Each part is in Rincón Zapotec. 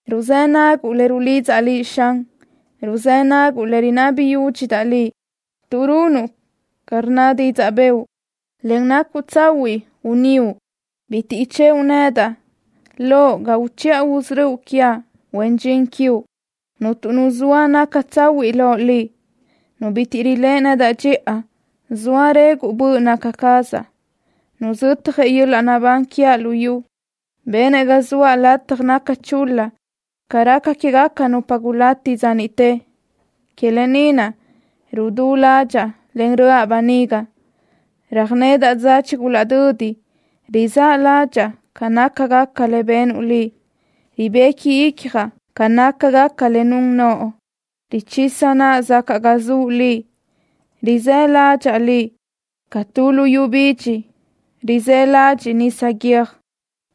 Ruzë́ naguʼ le rulidzaʼ Liʼ, Xan. Ruzë́ naguʼ le rinabi yúdxidaʼ Liʼ. Tuʼ runuʼ ca rnna didzaʼ bëʼu, en nacuʼ tsahuiʼ gunníuʼ bitiʼ ichëʼu nedaʼ loʼ ga uchiʼa usörö́uʼ quiaʼ, huen dxin quiuʼ. Cuntu nu zoa naca tsahuiʼ loʼ Liʼ. Nu bitiʼ riléʼe nedaʼ dxiʼa zoa reguʼ böʼ naca cazaʼ. Nuzötjëʼ yöl-laʼ naʼbán quiaʼ lu yu. Benëʼ ga zoaʼ lataj naca chul-la ca raca quégaca nupa gulati dza niʼte. Que lë ni naʼ rudú ládxaʼa, en röʼa böniga. Röjnedaʼ dza chigulaʼdödi. Rizáʼ ládxaʼa ca nácagaca le benuʼ Liʼ. Ribequi icjaʼ ca nácagaca le nun noʼo. Richisa naʼa zacaʼ ga zuʼ Liʼ. Rizë́ ládxaʼa Liʼ ca tu luyú bidxi rizë́ ladxiʼ nisa guiö́j.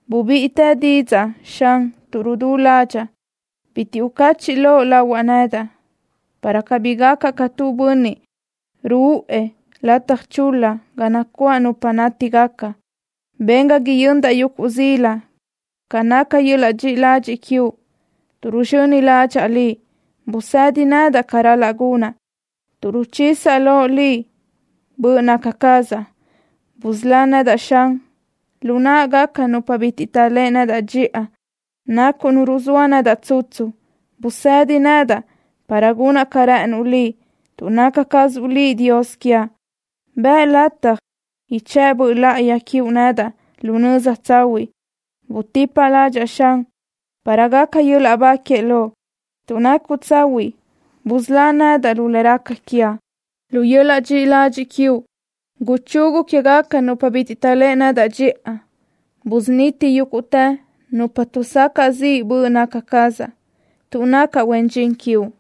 Bubíʼitë didzaʼ, Xan, tuʼ rudú ládxaʼa. Bitiʼ ucachiʼ loʼ lahuaʼ nedaʼ, para cabí gacaʼ ca tu bönniʼ ruʼë lataj chul-la ga nacuáʼ nupa nátigaca. Ben ga yöndaʼ yuguʼ zila ca naca yöl-laʼ dxiʼi ladxiʼ quiuʼ, tuʼ ruzxöni ládxaʼa Liʼ. Busëdi nedaʼ ca ral-laʼ gunaʼ, tuʼ ruchisaʼ loʼ Liʼ böʼ naca cazaʼ. Busölá nedaʼ, Xan, lu náʼagaca nupa bitiʼ taʼléʼe nedaʼ dxiʼa. Nacuʼ Nu ruzóa nedaʼ tsutsu. Busedi nedaʼ para gunaʼ ca rë́ʼënuʼ Liʼ, tuʼ naca cazuʼ Liʼ Dios quiaʼ. Bëʼ lataj ichë́ʼ Böʼ Láʼayi quiuʼ nedaʼ lu nöza tsahuiʼ. Butipa ládxaʼa, Xan, para gaca yöl-laʼ ba que Loʼ. Tuʼ nacuʼ tsahuiʼ busölá nedaʼ lu le raca quiaʼ. Lu yöl-laʼ dxiʼi ladxiʼ quiuʼ guchugu quégaca nupa bitiʼ taʼléʼe nedaʼ dxiʼa. Busuniti yúguʼtë nupa tuʼsacaʼ ziʼ böʼ naca cazaʼ, tuʼ nacaʼ huen dxin quiuʼ.